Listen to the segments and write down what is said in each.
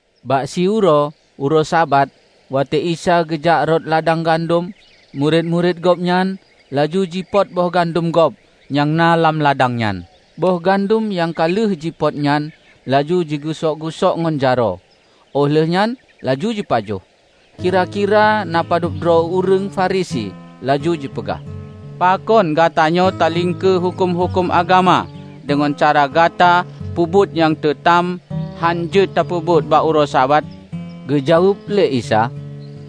Bak siuroe, uroe Sabat, watée Isa geujak rot ladang gandom, murit-murit Gobnyan laju jipot boh gandom gob nyang na lam ladang nyan. Boh gandom nyang ka lheueh jipot nyan laju jigeusok-geusok ngon jaroe, óh lheuehnyan laju jipajoh. Kira-kira na padub droe ureuëng Farisi laju jipeugah, "Pakon gatanyoe taliengkeu huköm-huköm agama deungon cara gata peubuet nyang teutam hán jeuet tapeubuet bak uroe Sabat?" Geujaweueb lé Isa,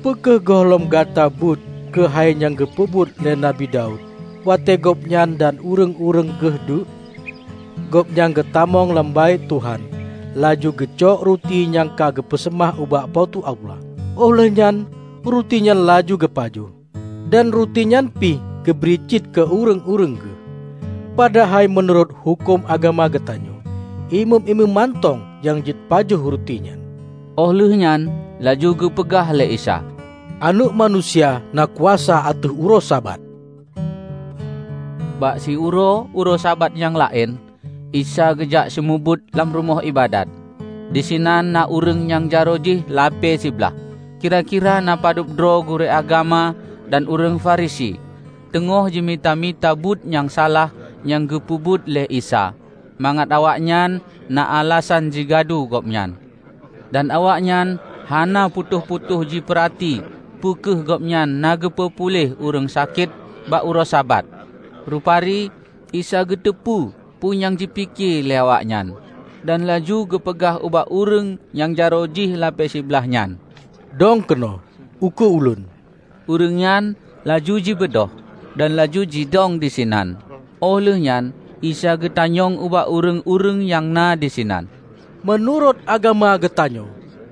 "Peu kheueh gohlom gata beuet keuhai nyang geupeubuet lé Nabi Daud, watée gobnyan dan ureuëng-ureuëng geuh deuk? Gobnyan geutamong lam Baét Tuhan laju geucok ruti nyang ka teupeuseumah ubak Po teu Allah, óh lheuehnyan ruti nyan laju geupajoh. Dan ruti nyan pih geubri cit keu ureuëng-ureuëng geuh. Padahai meunurot huköm agama geutanyoe, imeum-imeum mantong nyang jeuet pajoh ruti nyan." Óh lheueh nyan laju geupeugah lé Isa, "Aneuëk Manusia na kuasa ateueh uroe Sabat!" Bak siuroe, uroe Sabat nyang laén, Isa geujak seumeubeuet lam rumoh iébadat. Disinan na ureuëng nyang jaroe jih lapée siblaih. Kira-kira na padub droe gurée agama dan ureuëng Farisi teungoh jimita-mita buet nyang salah nyang geupeubuet lé Isa, mangat awaknyan na alasan jigadu Gobnyan. Dan awaknyan hana putôh-putôh jipeurati peu kheueh Gobnyan na geupeu puléh ureuëng sakét bak uroe Sabat. Rupari Isa geuteupeue peue nyang jipike lé awaknyan. Dan laju geupeugah ubak ureuëng nyang jaroe jih lapée siblaih nyan, "Dong keunoe, ukeue Ulôn!" Ureuëng nyan laju jibeudôh, dan laju jidong disinan. Óh lheueh nyan Isa geutanyong ubak ureuëng-ureuëng nyang na disinan, "Meunurot agama geutanyoe,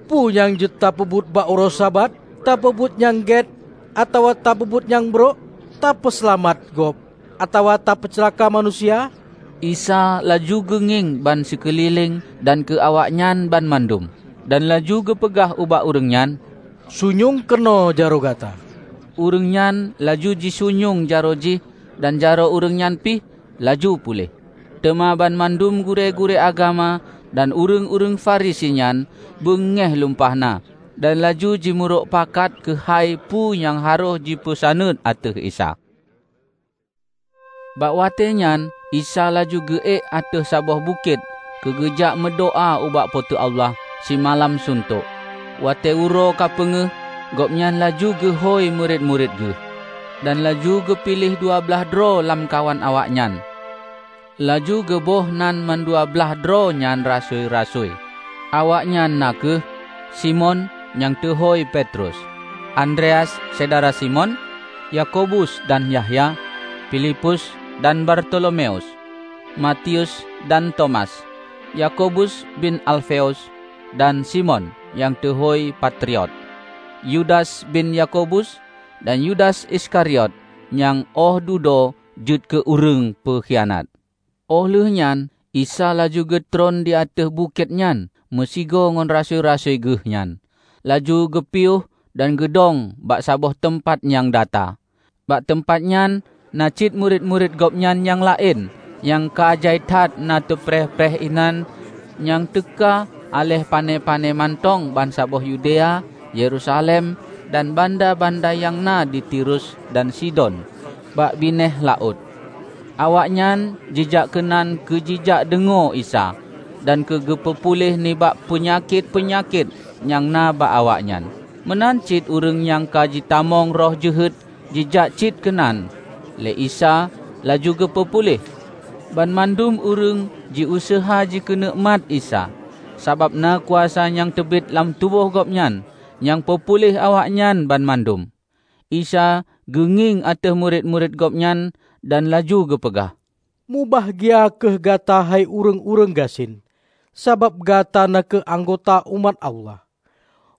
peue nyang jeuet tapeubuet bak uroe Sabat? Tapeubuet nyang gét atawa tapeubuet nyang brok? Tapeuseulamat gob atawa tapeuceulaka manusia?" Isa laju geungieng bansikeulileng dan keu awaknyan banmandum, dan laju geupeugah ubak ureuëng nyan, "Sunyueng keunoe jaroe gata." Ureuëng nyan laju jisunyueng jaroe jih dan jaroe ureuëng nyan pih laju puléh. Teuma banmandum gurée-gurée agama dan ureuëng-ureuëng Farisi nyan beungéh lumpah na, dan laju jimeurok pakat keuhai peue nyang harôh jipeusaneut ateueh Isa. Bak watée nyan Isa laju geu-ék ateueh saboh bukét keu geujak meudoá ubak Po teu Allah simalam suntok. Watée uroe ka peungéh, Gobnyan laju geuhôi murit-murit Geuh. Dan laju geupiléh dua blaih droe lamkawan awaknyan. Laju geuboh nan mandua blaih droe nyan rasui-rasui. Awaknyan na kheueh: Simon (Nyang teuhôi Petrus), Andreas syedara Simon; Yakobus dan Yahya, Pilipus dan Bartolomeus, Matius dan Tomas, Yakobus bin Alfeus, dan Simon (Nyang teuhôi Patriot), Yudas bin Yakobus dan Yudas Iskariot nyang óh dudoe jeuet keu ureuëng peukhianat. Óh lheueh nyan Isa laju geutron di ateueh bukét nyan meusigoe ngon rasui-rasui geuhnyan, laju geupiôh dan geudong bak saboh teumpat nyang data. Bak teumpat nyan na cit murit-murit Gobnyan nyang laén nyang ka jai that na teupreh-preh inan nyang teuka aléh pané-pané mantong bansaboh Yudea, Yerusalem, dan banda-banda nyang na di Tirus dan Sidon bak binéh laôt. Awaknyan jijak keunan keu jijak deungoe Isa, dan keu geupeu puléh nibak peunyakét-peunyakét nyang na bak awaknyan. Meunan cit ureuëng nyang ka jitamong roh jeuhet jijak cit keunan lé Isa laju geupeu puléh. Banmandum ureuëng jiuseuha jikeuneuk mat Isa, sabab na kuasa nyang teubiet lam tuboh Gobnyan nyang peupuléh awaknyan banmandum. Isa geungieng ateueh murit-murit Gobnyan dan laju geupeugah, "Mubahgia kheueh gata hei ureuëng-ureuëng gasien, sabab gata na kheueh anggota umat Allah!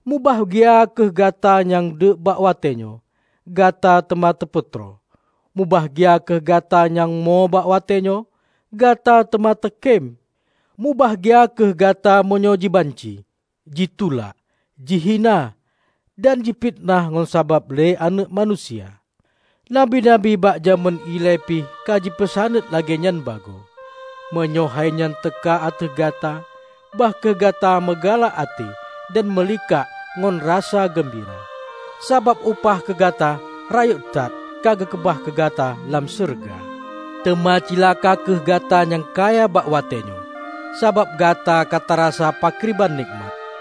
Mubahgia kheueh gata nyang deuk bak watée nyoe; gata teuma teupeutroe! Mubahgia kheueh gata nyang mo bak watée nyoe; gata teuma teukém! Mubahgia kheueh gata meunyoe jibanci, jitulak, jihina dan jifiteunah ngon sabab lé Aneuëk Manusia! Nabi-nabi bak jamén ilée pih ka jipeusaneut lagée nyan bagoe. Meunyoe hainyan teuka ateueh gata bah kheueh gata meugalak até dan meulikak ngon rasa geumbira, sabab upah keu gata rayeuk that ka geukeubah keu gata lam syeuruga. Teuma cilaka kheueh gata nyang kaya bak watée nyoe; sabab gata ka tarasa pakriban nekmat!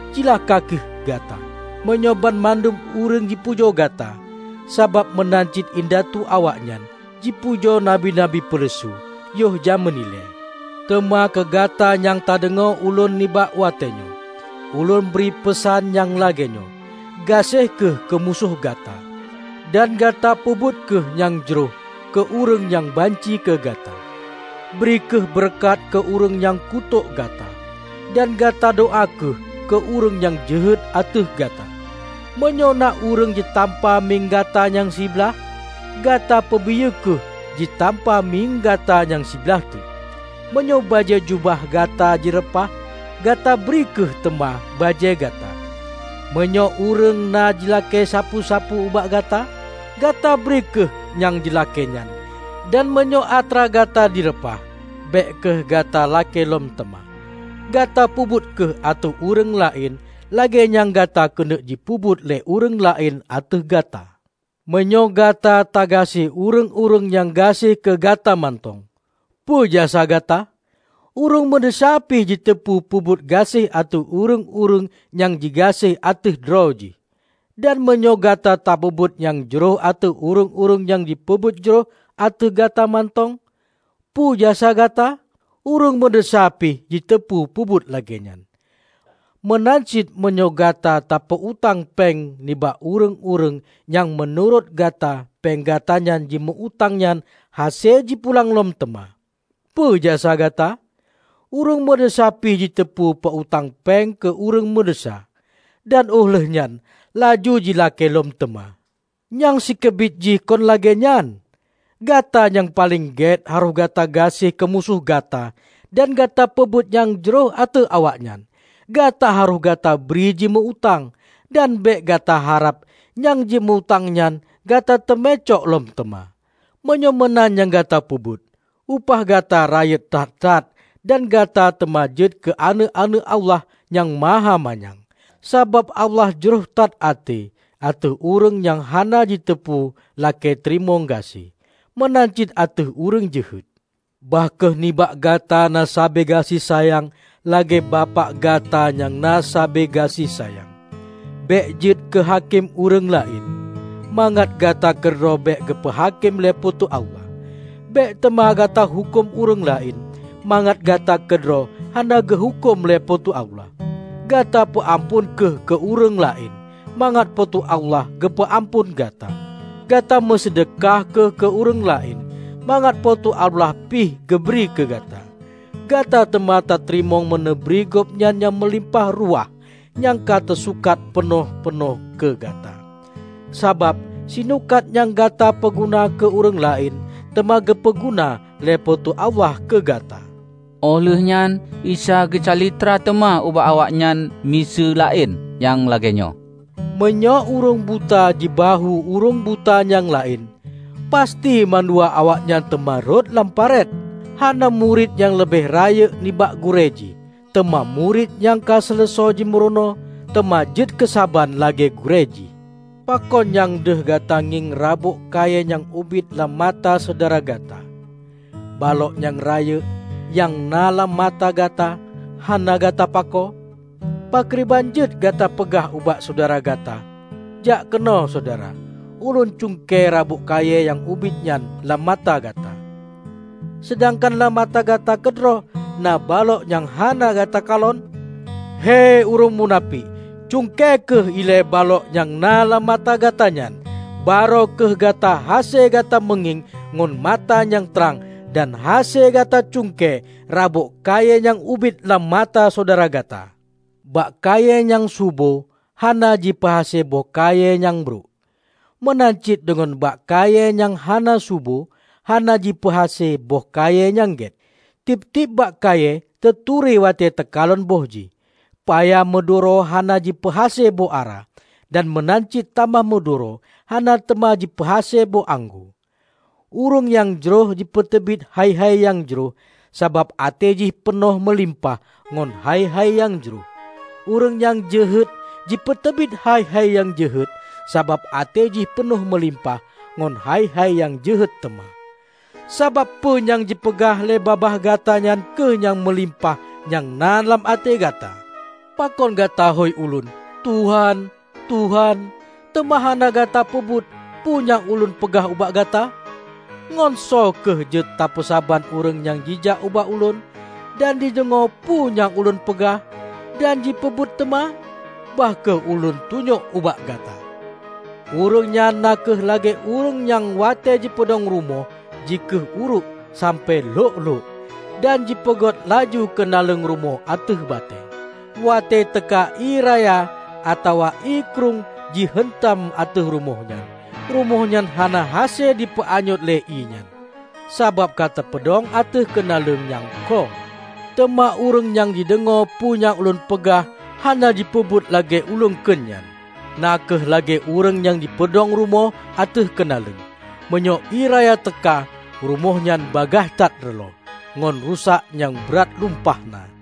Cilaka kheueh gata, meunyoe banmandum ureuëng jipujoe gata, sabab meunan cit indatu awaknyan jipujoe nabi-nabi peuleusu yoh jamén ilée." "Teuma keu gata nyang tadeungoe Ulôn nibak watée nyoe, Ulôn bri peusan nyang lagée nyoe: gaséh kheueh keu musoh gata, dan gata peubuet kheueh nyang jroh keu ureuëng nyang banci keu gata. Bri kheueh beureukat keu ureuëng nyang kutôk gata, dan gata doá kheueh keu ureuëng nyang jeuhet ateueh gata. Meunyoe na ureuëng jitampa mieng gata nyang siblaih, gata peubiyeu kheueh jitampa mieng gata nyang siblaih teuk. Meunyoe bajée jubah gata jireupah, gata bri kheueh teuma bajée gata. Meunyoe ureuëng na jilakée sapeue-sapeue ubak gata, gata bri kheueh nyang jilakée nyan; dan meunyoe atra gata jireupah, bék kheueh gata lakée lom teuma. Gata peubuet kheueh ateueh ureuëng laén lagée nyang gata keuneuk jipeubuet lé ureuëng laén ateueh gata. Meunyoe gata tagaséh ureuëng-ureuëng nyang gaséh keu gata mantong, peue jasa gata? Ureuëng meudesya pih jiteupeu peubuet gaséh ateueh ureuëng-ureuëng nyang jigaséh ateueh droe jih! Dan meunyoe gata tapeubuet nyang jroh ateueh ureuëng-ureuëng nyang jipeubuet jroh ateueh gata mantong, peu jasa gata? Ureuëng meudesya pih jiteupeu peubuet lagée nyan! Meunan cit meunyoe gata tapeu-utang péng ubak ureuëng-ureuëng nyang meunurot gata péng gata nyang jimeu-utang nyan hase jipulang lom teuma, peue jasa gata? Ureuëng meudesya pih jiteupeu peu-utang péng keu ureuëng meudesya, dan óh lheueh nyan laju jilakée lom teuma! Nyang sikeubiet jih kon lagée nyan! Gata nyang paleng gét harôh gata gaséh keu musoh gata dan gata peubuet nyang jroh ateueh awaknyan. Gata harôh gata bri jimeu-utang, dan bék gata harab nyang jimeu-utang nyan gata teumé cok lom teuma. Meunyoe meunan nyang gata peubuet, upah gata rayeuk that-that dan gata teuma jeuet keu aneuëk-aneuëk Allah Nyang Mahamanyang. Sabab Allah jroh that até ateueh ureuëng nyang hana jiteupeu lakée teurimong gaséh, meunan cit ateueh ureuëng jeuhet. Bah kheueh nibak gata na sabe gaséh sayang lagée Bapak gata nyang na sabe gaséh sayang!" "Bék jeuet keu hakém ureuëng laén, mangat gata keudroe bék geupeu hakém lé Po teu Allah. Bék teuma gata huköm ureuëng laén, mangat gata keudroe hana geuhuköm lé Po teu Allah. Gata peuamphon kheueh keu ureuëng laén, mangat Po teu Allah geupeu amphon gata. Gata meuseudeukah kheueh keu ureuëng laén, mangat Po teu Allah pih geubri keu gata; gata teuma tateurimong meuneubri gobnyan nyang meulimpah ruwah nyang ka teusukat peunoh-peunoh keu gata. Sabab sinukat nyang gata peuguna keu ureuëng laén teuma geupeu guna lé Po teu Allah keu gata." Óh lheueh nyan Isa geucalitra teuma ubak awaknyan miseue laén nyang lagée nyoe, "Meunyoe ureuëng buta jibahue ureuëng buta nyang laén, pasti mandua awaknyan teuma rhot lam paret. Hana murit nyang leubeh rayeuk nibak gurée jih. Teuma murit nyang ka seuleusoe jimurunoe, teuma jeuet keusaban lagée gurée jih. Pakon nyang deuh gata ngieng rabôk kayée nyang ubit lam mata syedara gata, balok nyang rayeuk nyang na lam mata gata hana gata pakoe? Pakriban jeuet gata peugah ubak syedara gata, 'Jak keunoe, syedara, ulôn cuengke rabôk kayée nyang ubit nyan lam mata gata,' seudangkan lam mata gata keudroe na balok nyang hana gata kalon? Hei ureuëng munafék! Cuengke kheueh ilée balok nyang na lam mata gata nyan. Barô kheueh gata hase gata meungieng ngon mata nyang trang dan hase gata cuengke rabôk kayée nyang ubit lam mata syedara gata." "Bak kayée nyang subo hana jipeuhase boh kayée nyang brok. Meunan cit deungon bak kayée nyang hana subo hana jipeuhase boh kayée nyang gét. Tieb-tieb bak kayée teuturi watée teukalon boh jih. Paya meuduro hana jipeuhase boh ara, dan meunan cit tamah meuduro hana teuma jipeuhase boh anggô. Ureuëng nyang jroh jipeuteubiet hai-hai nyang jroh sabab até jih peunoh meulimpah ngon hai-hai nyang jroh. Ureuëng nyang jeuhet jipeuteubiet hai-hai nyang jeuhet sabab até jih peunoh meulimpah ngon hai-hai nyang jeuhet teuma. Sabab peue nyang jipeugah lé babah gata nyan kheueh nyang meulimpah nyang na lam até gata." "Pakon gata hôi Ulôn, 'Tuhan, Tuhan,' teuma hana gata peubuet peue nyang Ulôn peugah ubak gata? Ngon soe kheueh jeuet tapeusaban ureuëng nyang jijak ubak Ulôn, dan jideungoe peue nyang Ulôn peugah, dan jipeubuet teuma? -- Bah kheueh Ulôn tunyok ubak gata -- Ureuëng nyan na kheueh lagée ureuëng nyang watée jipeudong rumoh jikhueh uruek sampoe lhok-lhok, dan jipeugét laju keunaleueng rumoh ateueh batée. Watée teuka ié raya atawa ié krueng ji heuntam ateueh rumoh nyan, rumoh nyan hana hase jipeuanyöt lé ié nyan, sabab ka teupeudong ateueh keunaleueng nyang kông. Teuma ureuëng nyang jideungoe peue nyang ulôn peugah hana jipeubuet lagée ulôn kheun nyan, na kheueh lagée ureuëng nyang jipeudong rumoh ateueh keunaleueng. Meunyoe ié raya teuka, rumoh nyan bagaih that reuloh; ngon rusak nyang brat lumpah na!"